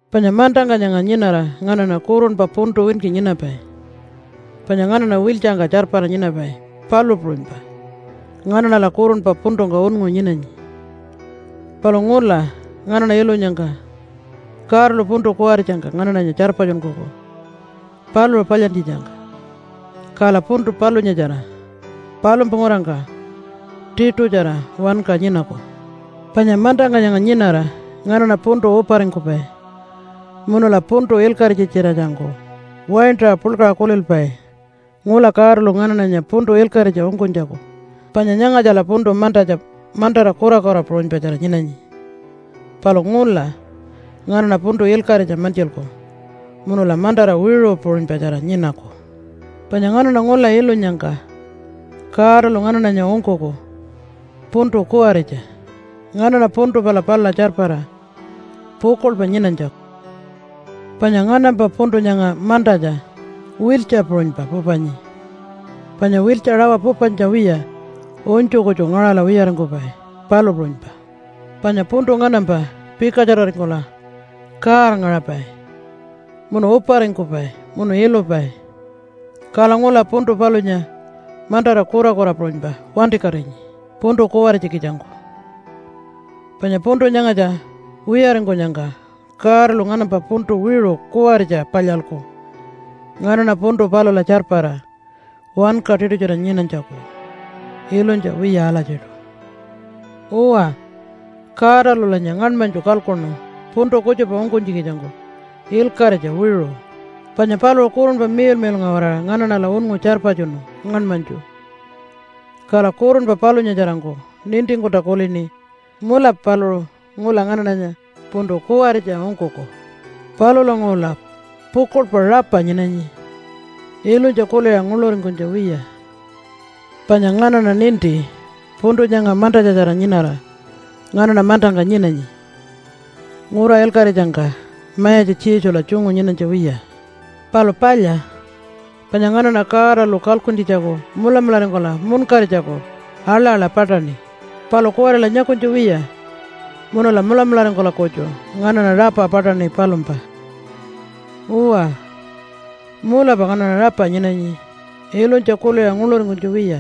Panya mantangka nyanga nyinara nganaṉa kurunpa puntu winki nyinapai, panya nganaṉa wiltjangka tjarpara nyinapai, palu puṟunypa nganaṉala kurunpa puntungka unngu nyinanyi. Palu ngula nganaṉa ilunyangka Godalu puntu kuwaritjangka nganaṉanya tjarpatjunkuku paluṟu palyantjitjangka, kala puntu palunyatjara palumpa ngurangka tiṯutjara wanka nyinaku. Panya mantangka nyanga nyinara nganaṉa puntu uparingkupai, munula puntu ilkaṟitja-tjiratjangku waintaṟa puḻkaṟa kulilpai ngula Godalu nganaṉanya puntu ilkaṟitja ungkunytjaku. Panya nyangatjala puntu mantatja mantara kurakura puṟunypatjara nyinanyi, palu ngula nganaṉa puntu ilkaṟitja mantjilku munula mantara wiṟu puṟunypatjara nyinaku. Panya nganaṉa ngula ilunyangka Godalu nganaṉanya ungkuku puntu kuwaritja nganaṉa puntu pala palula tjarpara pukuḻpa nyinanytjaku. Panya nganampa puntu nyanga mantatja wiltja puṟunypa pupanyi, panya wiltja rawa pupanytja wiya unytju kutju ngaṟala wiyaringkupai, palu puṟunypa. Panya puntu nganampa pikatjararingkula kaarngaṟapai munu uparingkupai munu ilupai, kala ngula puntu palunya mantara kurakura puṟunypa wantikatinyi puntu kuwaritja-kitjangku. Panya puntu nyangatja wiyaringkunyangka Godalu nganampa puntu wiṟu kuwaritja palyalku nganaṉa puntu palula tjarpara wanka tiṯutjara nyinanytjaku ilunytja wiya alatjiṯu. Uwa, Godalulanya ngaṉmanytju kalkuṉu puntu kutjupa ungkunytjikitjangku ilkaṟitja wiṟu. Panya paluṟu Kurunpa Miḻmiḻnga-waraṟa nganaṉala unngu tjarpatjunu ngaṉmanytju. Kala kurunpa palunyatjarangku nintingkulta kulini, “Mulapa paluṟu ngula nganaṉanya puntu kuwaritja ungkuku.” Palulanguṟula pukuḻpa rapa nyinanyi ilunytja kuliṟa nguḻuringkunytja wiya. Panya nganaṉa ninti puntu nyanga mantatjatjara nyinara nganaṉa mantangka nyinanyi, ngura ilkaṟitjangka Mayatja Jesula tjungu nyinanytja wiya. Palu palya, panya nganaṉa Godalu kalkuntjitjaku mulamularingkula munkaritjaku aḻa-aḻa paṯaṉi. Palu kuwarila nyakunytja wiya, munula mulamularingkula kutju nganaṉa rapa paṯaṉi palumpa. Uwa, mulapa nganaṉa rapa nyinanyi ilunytja kuliṟa nguḻuringkunytja wiya.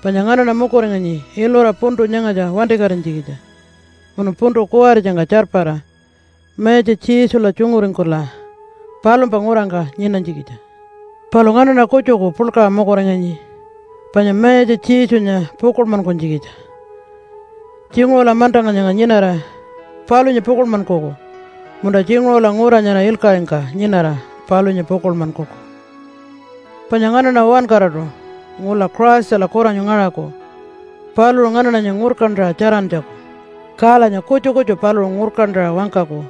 Panya nganaṉa mukuringanyi ilura puntu nyangatja wantikatinytjikitja munu puntu kuwaritjangka tjarpara Mayatja Jesula tjunguringkula palumpa ngurangka nyinanytjikitja. Palu nganaṉa kutjuku puḻkaṟa mukuringanyi panya Mayatja Jesunya pukuḻmankunytjikitja. Tjinguṟula mantangka nyanga nyinara palunya pukuḻmankuku, munta tjinguṟula ngura nyara ilkaṟingka nyinara palunya pukuḻmankuku. Panya nganaṉa uwankaraṯu ngula Christala kuranyu ngaṟaku paluṟu nganaṉanya ngurkantaṟa tjarantjaku, kalanya kutju kutju paluṟu ngurkantaṟa wangkaku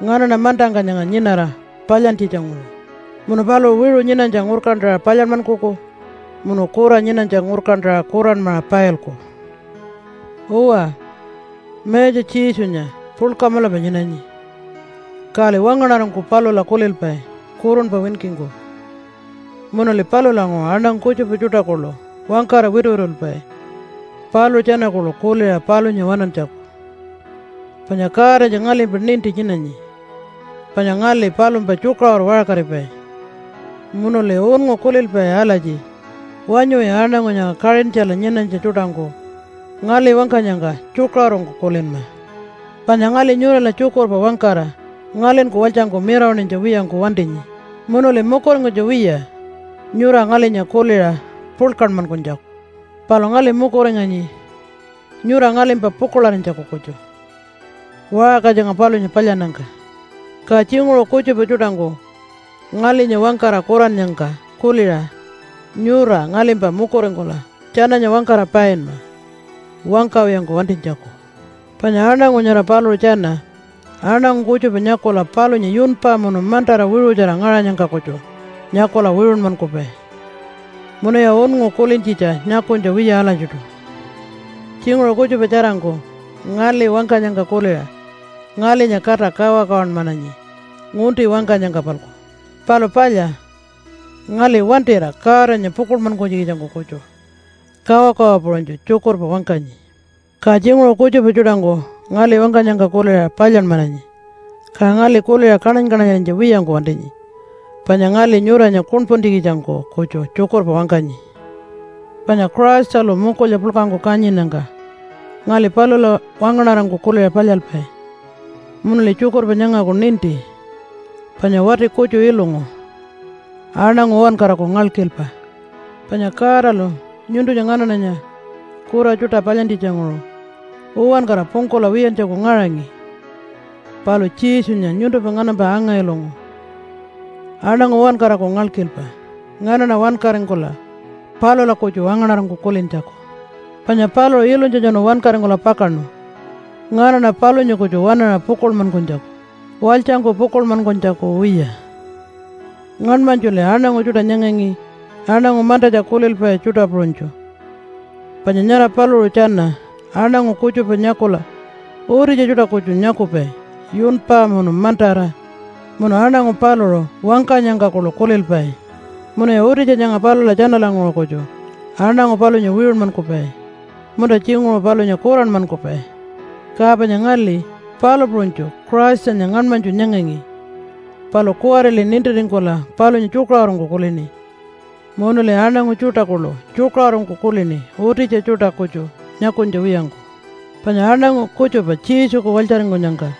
nganaṉa mantangka nyanga nyinara palyantjitja-nguṟu. Munu paluṟu wiṟu nyinanytja ngurkantaṟa palyanmankuku munu kura nyinanytja ngurkantaṟa kuranmaṟa pailku. Uwa, Mayatja Jesunya puḻka mulapa nyinanyi, kali wangaṉarangku palula kulilpai kurunpa winkingku. Munuli palulanguṟu aṉangu kutjupa tjuṯa kuḻu wangkara wituwitulpai paluṟu tjana kuḻu kuliṟa palunya waṉantjaku. Panya Godanya ngalimpa ninti nyinanyi panya ngali palumpa tjukaṟuru waṟkaripai, munuli unngu kulilpai alatji, “Wanyuwi aṉangu nyanga Kaṟintjala nyinanytja tjuṯangku ngali wangkanyangka tjukaṟurungku kulinma!” Panya ngali nyurala tjukurpa wangkara ngalinku walytjangku mirawaṉinytja wiyangku wantinyi. Munuli mukuringkunytja wiya nyura ngalinya kuliṟa puḻkanmankunytjaku. Palu ngali mukuringanyi nyura ngalimpa pukuḻarinytjaku kutju waṟka nyanga palunya palyannyangka. Ka tjinguṟu kutjupa tjuṯangku ngalinya wangkara kurannyangka kuliṟa nyura ngalimpa mukuringkula tjananya wangkara painma wangkawiyangku wantinytjaku. Panya aṉangu nyara paluṟu tjana aṉangu kutjupa nyakula palunya yunpa munu mantara wiṟutjara ngaṟanyangka kutju nyakula wiṟunmankupai, munuya unngu kulintjitja nyakunytja wiya alatjiṯu. Tjinguṟu kutjupa tjarangku ngali wangkanyangka kuliṟa ngalinya kata kawakawanmananyi ngunti wangkanyangka-palku. Palu palya, ngali wantira Godanya pukuḻmankunytjikitjangku kutju kawakawa puṟunytju tjukurpa wangkanyi. Ka tjinguṟu kutjupa tjuṯangku ngali wangkanyangka kuliṟa palyanmananyi, ka ngali kuliṟa kaṉany-kaṉanyarinytja wiyangku wantinyi panya ngali nyuranya kuṉpuntjikitjangku kutju tjukurpa wangkanyi. Panya Christalu mukulya puḻkangku kanyinnyangka ngali palula wangaṉarangku kuliṟa palyalpai. Munuli tjukurpa nyangaku ninti panya wati kutju ilungu aṉangu uwankaraku ngalkilpa. Panya Godalu nyuntunya nganaṉanya kura tjuṯa palyantjitjanguṟu uwankara pungkula wiyantjaku ngaṟangi. Palu Jesunya nyuntumpa nganampa anga-ilungu aṉangu uwankaraku ngalkilpa nganaṉa wankaringkula palula kutju wangaṉarangku kulintjaku. Panya paluṟu ilunytjatjanu wankaringkula pakaṉu nganaṉa palunya kutju waṉaṟa pukuḻmankunytjaku, walytjangku pukuḻmankunytjaku wiya. Ngaṉmanytjuli aṉangu tjuṯa nyangangi aṉangu mantatja kulilpai tjuṯa puṟunytju. Panya nyara paluṟu tjana aṉangu kutjupa nyakula utitja tjuṯa kutju nyakupai yunpa munu mantara munu aṉangu paluṟu wangkanyangka kuḻu kulilpai munuya utitja nyanga palula tjanalanguṟu kutju aṉangu palunya wiṟunmankupai, munta tjinguṟu palunya kuranmankupai. Ka panya ngali palu puṟunytju Christanya ngaṉmanytju nyangangi. Palu kuwarili nintiringkula palunya tjukaṟurungku kulini, munuli aṉangu tjuṯa kuḻu tjukaṟurungku kulini utitja tjuṯa kutju nyakunytja wiyangku. Panya aṉangu kutjupa Jesuku walytjaringkunyangka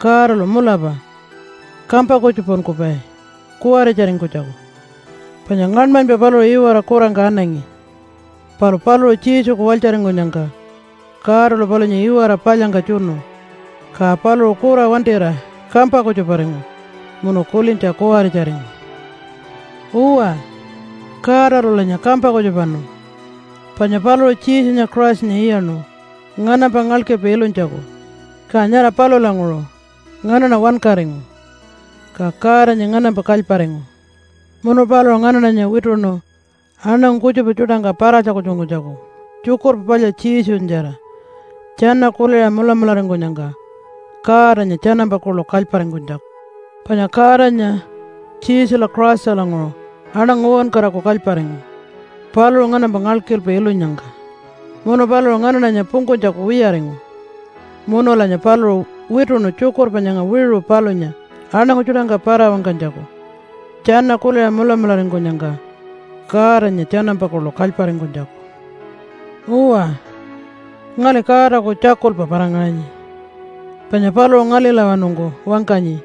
Godalu mulapa kampa kutjupankupai kuwaritjaringkunytjaku. Panya ngaṉmanypa paluṟu iwara kurangka anangi, palu paluṟu Jesuku walytjaringkunyangka Godalu palunya iwara palyangka tjunu, ka paluṟu kura wantira kampa kutjuparingu munu kulintja kuwaritjaringu. Uwa, Godalulanya kampa kutjupanu, panya paluṟu Jesunya Christanya iyaṉu nganampa ngalkilpa ilunytjaku, ka nyara palulanguṟu nganaṉa wankaringu ka Godanya nganampa kalyparingu. Munu paluṟu nganaṉanya wituṉu aṉangu kutjupa tjuṯangka para-tjakultjunkunytjaku Tjukurpa Palya Jesunyatjara tjana kuliṟa mulamularingkunyangka Godanya tjanampa kuḻu kalyparingkunytjaku. Panya Godanya Jesula Christalanguṟu aṉangu uwankaraku kalyparingu paluṟu nganampa ngalkilpa ilunyangka munu paluṟu nganaṉanya pungkunytjaku wiyaringu. Munulanya paluṟu wituṉu tjukurpa nyanga wiṟu palunya aṉangu tjuṯangka para-wangkanytjaku tjana kuliṟa mulamularingkunyangka Godanya tjanampa kuḻu kalyparingkunytjaku. Uwa, ngali Godaku tjakulpa para-ngaṟanyi, panya paluṟu ngalilawanungku wangkanyi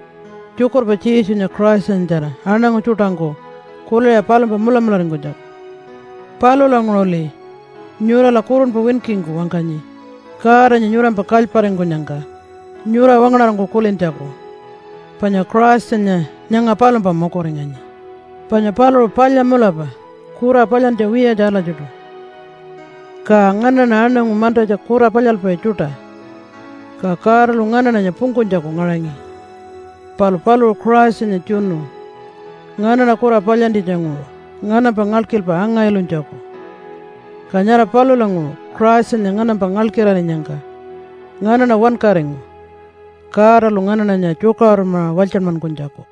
tjukurpa Jesunya Christanyatjara aṉangu tjuṯangku kuliṟa palumpa mulamularingkunytjaku. Palulanguṟuli nyurala kurunpa winkingku wangkanyi Godanya nyurampa kalyparingkunyangka nyura wangaṉarangku kulintjaku, panya Christanya nyanga palumpa mukuringanyi. Panya paluṟu palya mulapa kura palyantja wiyatja alatjiṯu, ka nganaṉa aṉangu mantatja kura palyalpai tjuṯa, ka Godalu nganaṉanya pungkunytjaku ngaṟangi. Palu paluṟu Christanya tjunu nganaṉa kura palyantjitjanguṟu nganampa ngalkilpa anga-ilunytjaku. Ka nyara palulanguṟu Christanya nganampa ngalkilarinyangka nganaṉa wankaringu Godalu nganaṉanya tjukaṟurunmaṟa walytjanmankunytjaku.